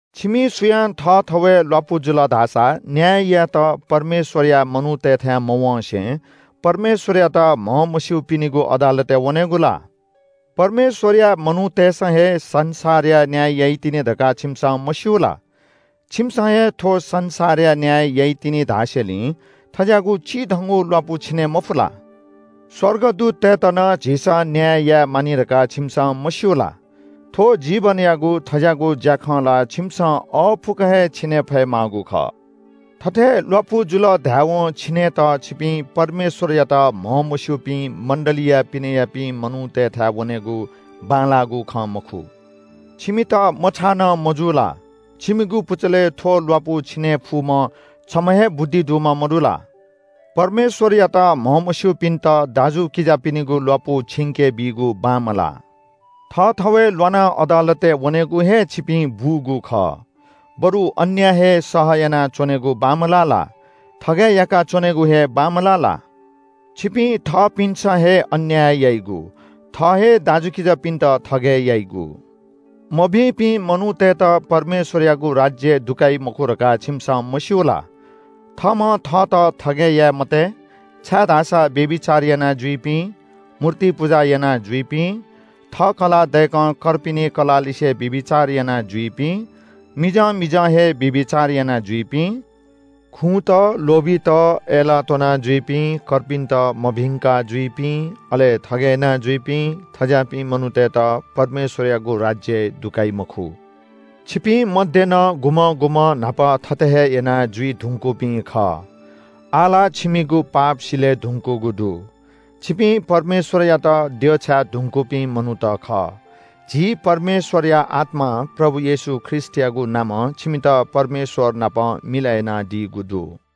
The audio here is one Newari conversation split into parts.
छिमि सुयां थःथवय् ल्‍वापु जुल धाःसा न्‍याय यायेत परमेश्‍वरया मनूतय्‌थाय् मवँसे परमेश्‍वरयात म्‍हमस्‍यूपिनिगु अदालतय् वनेगु ला? परमेश्‍वरया मनूतय्‌सं हे संसारया न्‍याय याइतिनि धकाः छिमिसं मस्‍यू ला? छिमिसं हे थ्‍व संसारया न्‍याय याइतिनि धासेंलि थज्‍याःगु चिधंगु ल्‍वापु छिने मफु ला? स्‍वर्गदूततय्‌त नं झीसं न्‍याय याये मानि धकाः छिमिसं मस्‍यू ला? थ्‍व जीवनयागु थज्‍याःगु ज्‍याखँ ला छिमिसं अःपुक हे छिने फयेमाःगु खः। थथे ल्‍वापु जुल धायेवं छिनेत छिपिं परमेश्‍वरयात म्‍हमस्‍यूपिं मण्‍डलीया पिनेयापिं मनूतय्‌थाय् वनेगु बांलाःगु खँ मखु। छिमित मछाः नं मजू ला? छिमिगु पुचलय् थ्‍व ल्‍वापु छिने फुम्‍ह छम्‍ह हे बुद्धि दुम्‍ह मदु ला? परमेश्‍वरयात म्‍हमस्‍यूपिन्‍त दाजुकिजापिनिगु ल्‍वापु छिंके बीगु बांमलाः। थःथवय् ल्‍वानाः अदालतय् वनेगु हे छिपिं बूगु खः। बरु अन्‍याय हे सह यानाच्‍वनेगु बांमलाः ला? थगय् याका च्‍वनेगु हे बांमलाः ला? छिपिं थःपिन्‍सं हे अन्‍याय याइगु। थः हे दाजुकिजापिन्‍त थगय् याइगु। मभिंपिं मनूतय्‌त परमेश्‍वरयागु राज्‍यय् दुकाइ मखु धकाः छिमिसं मस्‍यू ला? थःम्‍हं थःत थगय् याये मते, छाय्‌धाःसा व्‍यभिचार यानाजुइपिं, मूर्ति पुजा यानाजुइपिं, थः कलाः दय्‌कं कर्पिनि कलाःलिसे व्‍यभिचार यानाजुइपिं, मिजं मिजं हे व्‍यभिचार यानाजुइपिं, खुँत, लोभीत, अय्‌लाः त्‍वनाजुइपिं, कर्पिन्‍त मभिंका जुइपिं, अले थगय् यानाजुइपिं – थज्‍याःपिं मनूतय्‌त परमेश्‍वरयागु राज्‍यय् दुकाइ मखु। छिपिं मध्‍ये नं गुम्‍हं गुम्‍हं न्‍हापा थथे हे याना जुइ धुंकूपिं खः। आः ला छिमिगु पाप सिले धुंकूगु दु। छिपिं परमेश्‍वरयात देछाये धुंकूपिं मनूत खः। झी परमेश्‍वरया आत्‍मां प्रभु येशू ख्रीष्‍टयागु नामं छिमित परमेश्‍वर नाप मिलय् यानादीगु दु।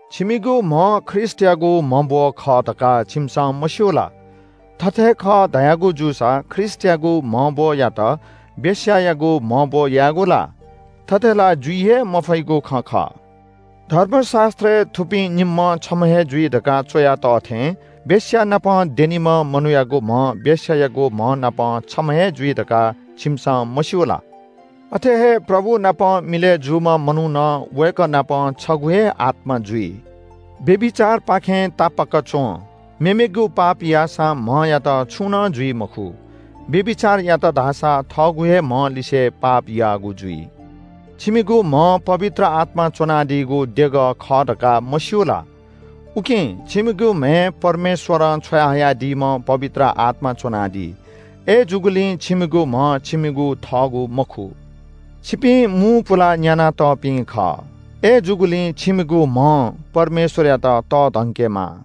छिमिगु म्‍ह ख्रीष्‍टयागु म्‍हब्‍व खः धकाः छिमिसं मस्‍यू ला? थथे खः धयागु जूसा ख्रीष्‍टयागु म्‍हब्‍वयात वेश्‍यायागु म्‍हब्‍व यायेगु ला? थथे ला जुइ हे मफइगु खँ खः। धर्मशास्‍त्रय् “थुपिं निम्‍हं छम्‍ह हे जुइ” धकाः च्‍वया तः थें वेश्‍यानाप द्यनीम्‍ह मनूयागु म्‍ह वेश्‍यायागु म्‍ह नाप छम्‍ह हे जुइ धकाः छिमिसं मस्‍यू ला? अथे हे प्रभु नाप मिलय् जूम्‍ह मनू नं वय्‌कः नाप छगू हे आत्‍मा जुइ। व्‍यभिचारपाखें तापाक च्‍वँ। मेमेगु पाप याःसां म्‍हयात छुं नं जुइ मखु। व्‍यभिचार यात धाःसा थःगु हे म्‍ह लिसे पाप याःगु जुइ। छिमिगु म्‍ह पवित्र आत्‍मा च्‍वनादीगु देगः खः धकाः मस्‍यू ला? उकिं छिमिगु म्‍हय् परमेश्‍वरं छ्वयाहयादीम्‍ह पवित्र आत्‍मा च्‍वनादी। अय्‌जूगुलिं छिमिगु म्‍ह छिमिगु थःगु मखु। छिपिं मू पुलाः न्‍याना तःपिं खः। अय्‌जूगुलिं छिमिगु म्‍हं परमेश्‍वरयात तःधंकेमाः।